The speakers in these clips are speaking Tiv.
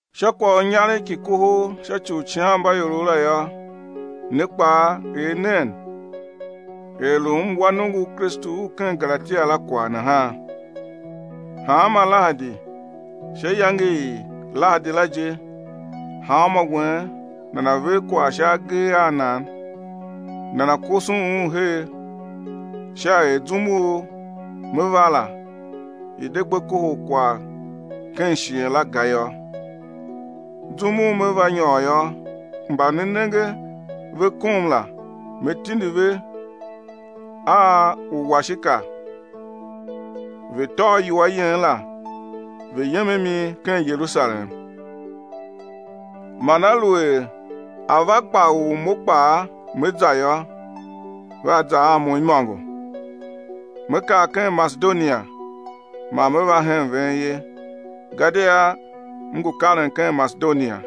Sha kwagh u inyaregh ki kohol sha ci u uicighanmbaiorov la yô, ne kpaa, er nen er lu m wa nongo u Kristu u ken Galatia la kwagh nahan. Hanma lahadi, sha iyange i lahadi la je, hanmô wen nana̱ ver kwagh sha agee a nan, nana̱ koson un her sha er zum u me va la, i̱ de gbe kohol kwagh ken shighe la ga yô. Zum u me va nyôr yô, mba ne nenge ve kom la, me tindi ve a uwashika, ve̱ tôô iwua yen la, ve̱ yem a mi ken Yerusalem. Man aluer a va gba u mo kpaa me za yô, vea za a mo imôngo. Me kar ken Masedonia man me va hen ven ye, gadia m ngu karen ken Masedonia.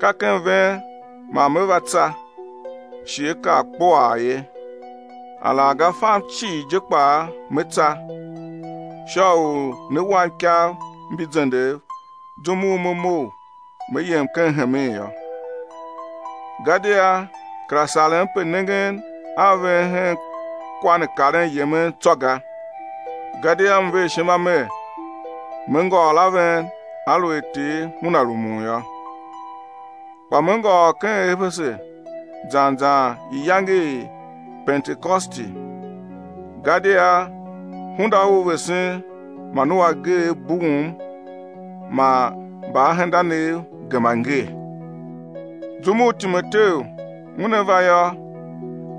Ka ken ven man me va tsa, shighe á kar kpuaa ye. Alaghga fam cii je kpaa me tsa, sha u né wam ikav mbi zendev zum u me mough me yem ken hemen yô. Gadia kera sarem pe nengen a ven hen kwa ne karen yemen tsô ga, gadia m ver ishima mer, me ngôôr a ven aluer Ter Una rumun yô. Kpa me ngôôr ken Efese zan zan iyange i Pentekosti. Gadia hunda u vesen man u ageegh bughum man mbaahendanev gema ngee. Zum u Timoteu una va yô,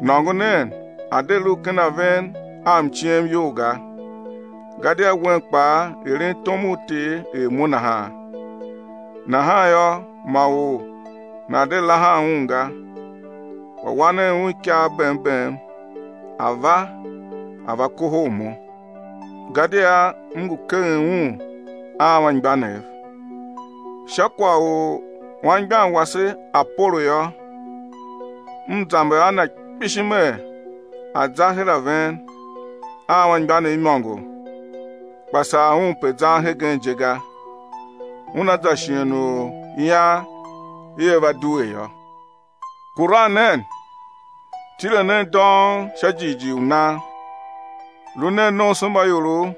nôngo nen, a̱ de lu ken a ven a mciem iyol ga, gadia wen kpaa eren tom u Ter er mo nahan. Nahan yô, ma or nana̱ de lahan un ga. Kpa wa nen un ikav bem bem, a̱ va, a̱ va kohol mo. Gadia m ngu keghen un a anmgbianev. Sha kwagh u anmgbian wase Apolo yô, m zamber a na kpishi mer, a̱ za her a ven a anmgbianev imôngo, kpa sar un pe zan hegen je ga, una za shighe u ian ia va due yô. Kuran nen, tile nen dông sha jighjigh u nan. Lu nen nomsombaiorov,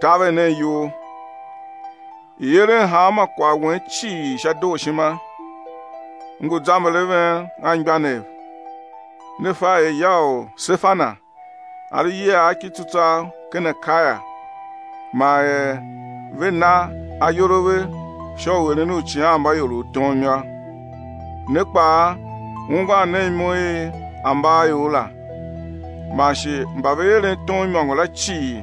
taver nen iyol. I̱ eren hanma kwagh wen cii sha dooshima. M ngu zamber a ven, anmgbianev; ne fa er ya u Sefana a lu iyiagh ki tsutswagh ken Akaia man er ve na ayol a ve sha u eren uicighanmbaiorov tom yô. Ne kpaa ungwan nen imo i ambaaior la, man shi mba ve eren tom imôngo la cii,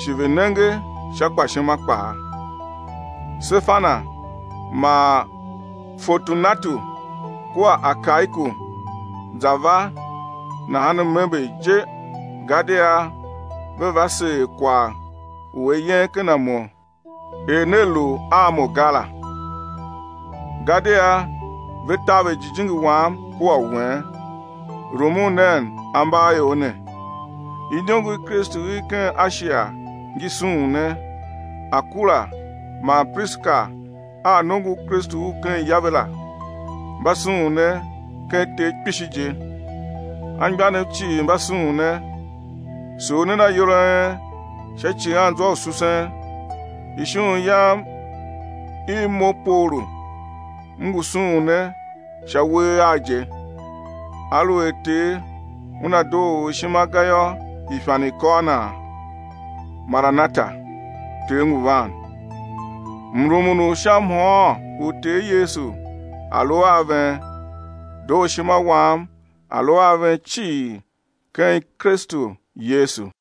shi ve nenge sha gbashima kpaa. Sefana man Fortunatu kua Akaiku za va nahan m ember je gadia ve va seer kwagh u a yen ken a mo er ne lu a mo ga la. Gadia ve taver jijingi wam kua u wen. Rumun nen ambaaior ne. Iniongo i Kristu i ken Ashia ngi sughun ne. Akula man Prishila a nongo u Kristu u ken ya ve la, mba sughun ne ken Ter kpishi je. Anmgbianev cii mba sughun ne. Sugh nen ayol a en sha icighanzwa u susen. Ishughun yam i mo, Paulu, m ngu sughun ne sha uwegh agh je. Aluer Ter Una doo or ishima ga yô, ifan i̱ kôr nan. Maranata. (Ter ngu van.) Mrumun u sha mhôôn u Ter Yesu a̱ lu a ven. Dooshima wam a̱ lu a ven cii ken Kristu Yesu.